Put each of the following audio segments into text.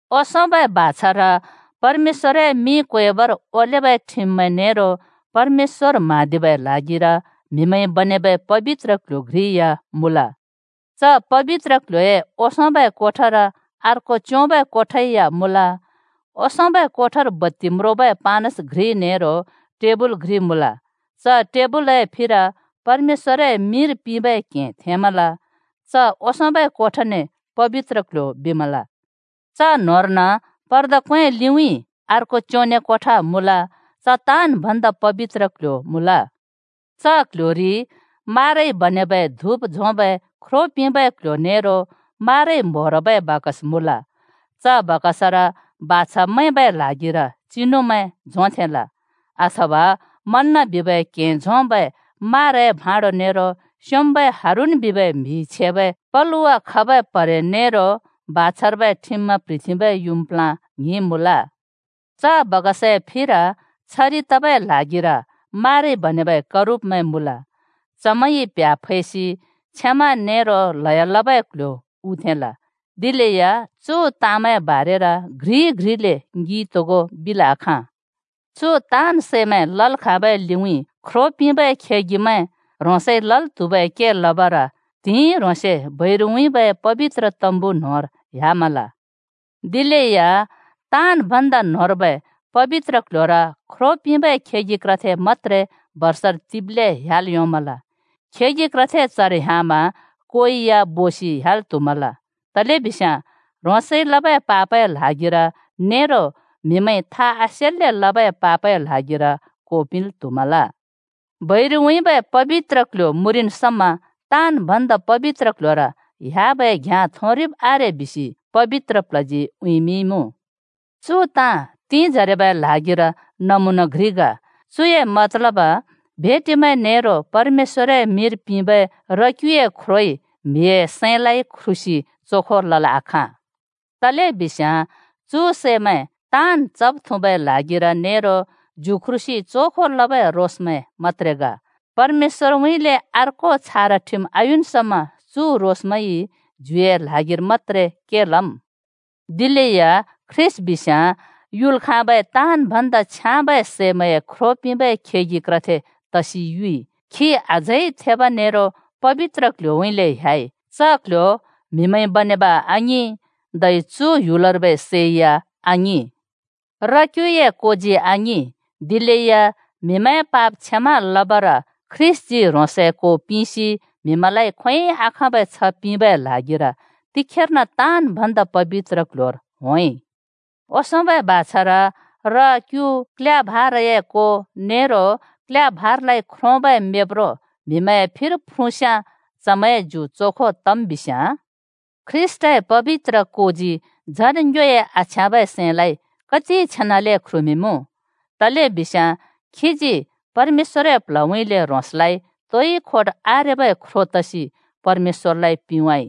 ओंसोंबै बाछार परमेश्‍वरए मिं क्वेबर ओलेबै ठिममैं नेरो परमेश्‍वर म्हाँदिबै ल्हागिर म्हिमैंइ बनेबै पबित्र क्ल्‍ह्‍यो घ्रि या मुँल। च पबित्र क्ल्ह्‍योए ओंसोंबै कोठार अर्को च्‍योंबै कोठा या मुँल। ओंसोंबै कोठार बत्ति म्रोंबै पानस घ्रि नेरो टेबल घ्रि मुँल। च टेबलए फिर परमेश्‍वरए मिंर पिंबै क्हें थेंमल। च ओंसोंबै कोठाने “पबित्र क्‍ल्‍ह्‍यो” बिमल। च न्‍होंर्न पर्दा क्‍वें लिउँइँ अर्को च्योंने कोठा मुँल। च “ताँन् भन्दा पबित्र क्‍ल्‍ह्‍यो” मुँल। च क्‍ल्‍होरी माराइ बनेबै धुप झोंबै ख्रो पिंबै क्ल्ह्‍यो नेरो माराइ म्‍होरबै बाकस मुँल। च बाकसर बाछा मैंबै ल्हागिर चिनुमैं झोंथेंल, अथवा मन्‍ना बिबै क्हें झोंबै माराए भाँडो नेरो स्‍योंम्‍बै हारून बिबै म्‍हिइ छेबै पलुवा खबै प्‍हरे, नेरो बाछार्बै ठिममैं प्‍ह्रिथेंबै युँम् प्ला ‍ङ्हिं मुँल। च बाकसए फिर छरि तबै ल्हागिर माराइ बनेबै करूबमैं मुँल। चमैंइ प्‍ह्‍या फैसि क्षमा नेरो ल्हयो लबै क्‍ल्‍ह्‍यो उथेंल। दिलेया चु ताँमैंए बारेर घ्रि घ्रिले ङिइ तोगो बिल् आखाँ। चु ताँन् सैमैं लल् खाँबै लिउँइँ ख्रो पिंबै खेगिमैं ह्रोंसइ लल् त्हुबै के लबर त्हिंइ ह्रोंसे बैरुउँइँबै पबित्र तम्बु न्होंर ह्‍यामल। दिलेया ताँन् भन्दा न्होंर्बै पबित्र क्ल्ह्‍योर ख्रो पिंबै खेगि क्रथे मत्‍त्रे बर्षर तिब्ले ह्‍याल् योंमल। खेगि क्रथे चर ह्‍यामा कोइ या बोसि ह्‍याल् त्हुमल, तलेबिस्याँ ह्रोंसइ लबै पापए ल्हागिर नेरो म्हिमैंइ था आसेन्ले लबै पापए ल्हागिर को पिंल् त्हुमल। बैरुउँइँबै पबित्र क्ल्ह्‍यो मुँरिन् समा “ताँन् भन्दा पबित्र क्ल्ह्‍योर” ह्‍याबै घ्याँ थोंरिब् आरे बिसि पबित्र प्ल्हजी उँइँमिंइमुँ। चु ताँ तिंजरेबै ल्हागिर नमुना घ्रि ग। चुए मतलब भेटिमैं नेरो परमेश्‍वरए मिंर पिंबै र-क्‍युए ख्रोइ म्‍हिए सैंलाइ ख्रुसि चोखो लल् आखाँ। तलेबिस्याँ चु सैमैं ताँन् चब्, थुँबै ल्हागिर नेरो ज्यु ख्रुसि चोखो लबै रोसमैं मत्त्रे ग। परमेश्‍वरउँइँले अर्को छारा ठिम आयुन् समा चु रोसमैंइ ज्युए ल्हागिर मत्‍त्रे के लम्। दिलेया ख्रीष्‍ट बिस्याँ युल् खाँबै ताँन् भन्दा छ्याँबै सैमैंए ख्रो पिंबै खेगि क्रथे तसि युइ। खी अझै थेब नेरो पबित्र क्ल्ह्‍योउँइँले ह्‍याइ, च क्ल्ह्‍यो म्‍हिमैंइ बनेब आङिं। धै चु ह्‍युलर्बै सै या आङिं। र-क्युए कोजी आङिं, दिलेया म्हिमैंए पाप क्षमा लबर ख्रीष्‍टजी ह्रोंसए को पिंसि म्हिमैंलाइ खोंयोंइ आखाँबै छ्ह पिंबै ल्हागिर तिखेर्न ताँन् भन्दा पबित्र क्ल्ह्‍योर होंइ। ओंसोंबै बाछार, र-क्यु, क्‍ल्‍या भाराए को नेरो क्‍ल्‍या भारालाइ ख्रोंबै मेब्रो म्‍हिमैंए फिर फ्रुँस्याँ चमैंए ज्यु चोखो तम् बिस्याँ। ख्रीष्‍टए पबित्र कोजी झन् ङ्योए आछ्याँबै सैंलाइ कति छेनाले ख्रुमिंमुँ। तलेबिस्याँ खीजी परमेश्‍वरए प्ल्हउँइँले ह्रोंसलाइ तोइ खोट आरेबै ख्रो तसि परमेश्‍वरलाइ पिंवाइ।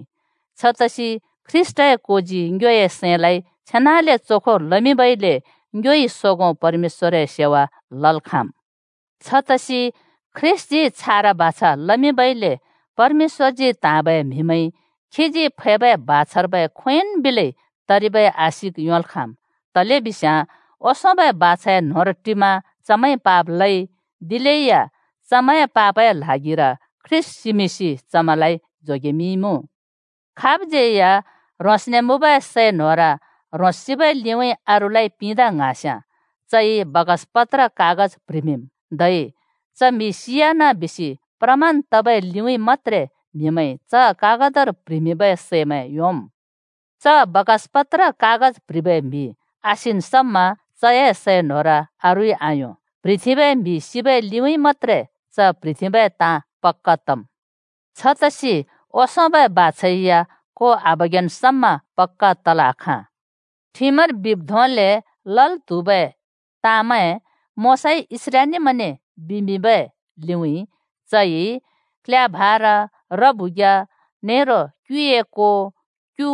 छतसि ख्रीष्‍टए कोजी ङ्योए सैंलाइ छेनाले चोखो लमिंबइले ङ्योइ सोगों परमेश्‍वरए सेवा लल् खाँम्। छतसि ख्रीष्‍टजी छारा बाछा लमिंबइले परमेश्‍वरजी त्‍हाँबै म्‍हिमैंइ खीजी फैबै बाछार्बै खोंयोंन् बिलै तरिबै आशिक योंल् खाँम्। तलेबिस्याँ ओंसोंबै बाछाए न्‍होंर टिमा चमैंइ पाप लइ, दिलेया चमैंए पापए ल्हागिर ख्रीष्‍ट सिमिंसि चमैंलाइ जोगेमिंइमुँ। खाबज्यै या ह्रोंसने मुँबै सै न्होर ह्रोंस सिबै लिउँइँ अरूलाइ पिंदा ङ्हाँस्याँ चइ बाकसपत्र कागज प्‍ह्रिमिंम्। धै “च म्‍हि सियाना” बिसि प्रमाण तबै लिउँइँ मत्‍त्रे म्‍हिमैंइ च कागतर प्‍ह्रिमिंबै सैमैं योंम्। च बाकसपत्र कागज प्‍ह्रिबै म्‍हि आसिन् समा चए सै न्होर अरूइ आयों, प्‍ह्रिथेंबै म्‍हि सिबै लिउँइँ मत्‍त्रे च प्‍ह्रिथेंबै ताँ पक्‍का तम्। छतसि ओंसोंबै बाछा या को आबगेन् समा पक्‍का तल् आखाँ। ठिमर बिब् धोंले लल् त्हुबै ताँमैं मोशाइ इस्राएलीमैंने बिमिंबै लिउँइँ चइ क्‍ल्‍या भारा, र-बुख्या नेरो क्‍युए को, क्यु,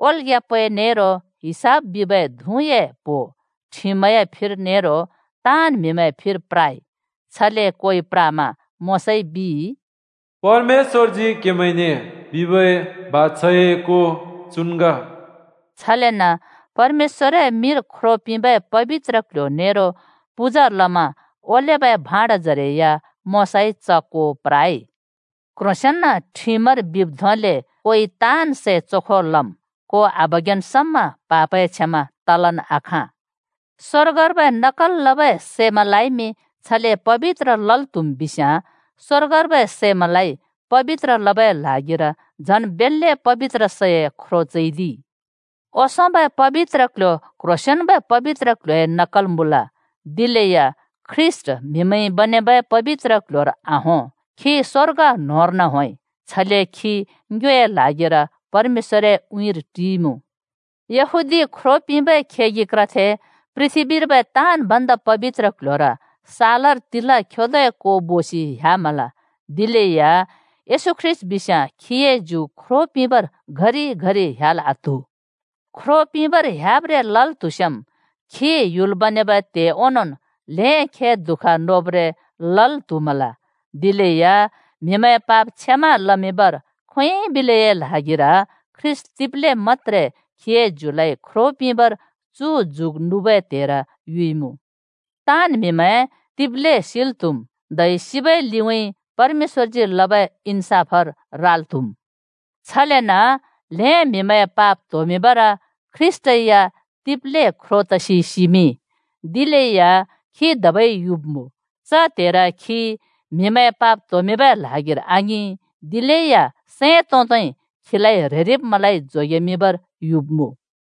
ओल्‍ग्‍या पै नेरो हिसप बिबै धुँए प्हो ठिमए फिर नेरो ताँन् म्‍हिमैंए फिर प्राइ। छले कोइ प्रामा मोशाइ बिइ, “परमेश्‍वरजी क्‍हेमैंने बिबै बाछाए को चुन् ग।” छलेन परमेश्‍वरए मिंर ख्रो पिंबै पबित्र क्ल्ह्‍‍यो नेरो पूजा लमा ओलेबै भाँडजरे या मोशाइ च को प्राइ। क्‍ह्रोंसेंन ठिमर बिब् धोंले कोइ ताँन् सै चोखो लम्। को आबगेन् समा पापए क्षमा तलन् आखाँ। स्वर्गर्बै नकल लबै सैमैंलाइमि छले पबित्र लल् त्हुम् बिस्याँ, स्‍वर्गर्बै सैमैंलाइ पबित्र लबै ल्हागिर झन् बेल्‍ले पबित्र सैए ख्रो चैदिइ। ओंसोंबै पबित्र क्‍ल्‍ह्‍यो क्ह्रोंसेंन्बै पबित्र क्ल्ह्‍योए नकल मुँल। दिलेया ख्रीष्‍ट म्‍हिमैंइ बनेबै पबित्र क्‍ल्‍ह्‍योर आहों, खी स्‍वर्ग न्होंर्न होंइ। छले खी ङ्योए ल्हागिर परमेश्‍वरए उँइँर टिइमुँ। यहूदी ख्रो पिंबै खेगि क्रथे पृथ्‍बीर्बै “ताँन् भन्दा पबित्र क्‍ल्‍ह्‍योर” सालर तिला खेदोए को बोसि ह्‍यामल। दिलेया येशू ख्रीष्‍ट बिस्याँ खीए ज्यु ख्रो पिंबर घरि घरि ह्‍याल् आत्हु। ख्रो पिंबर ह्‍याब्रे लल् त्हुस्याँम् खी ह्‍युल बनेबै त्हे ओंनोंन् ल्हें खे दुःख नोब्रें लल् त्‍हुमल। दिलेया म्हिमैंए पाप क्षमा लमिंबर खोंयोंइ बिलैए ल्हागिर ख्रीष्‍ट तिब्‍ले मत्‍त्रे खीए ज्युलाइ ख्रों पिंबर चु जुग नुबै त्हेर युइमुँ। ताँन् म्‍हिमैं तिब्‍ले सिल् त्‍हुम्, धै सिबै लिउँइँ परमेश्‍वरजी लबै इन्‍साफर राल् त्‍हुम्। छलेन ल्‍हें म्‍हिमैंए पाप त्होमिंबर ख्रीष्‍ट या तिब्‍ले ख्रो तसि सिमिंइ। दिलेया खी धबै युब्‍मुँ। च त्हेर खी म्हिमैंए पाप त्होमिंबै ल्हागिर आङिं, दिलेया सैं तोंदै खीलाइ ह्रेरिब्मैंलाइ जोगेमिंबर युब्‍मुँ।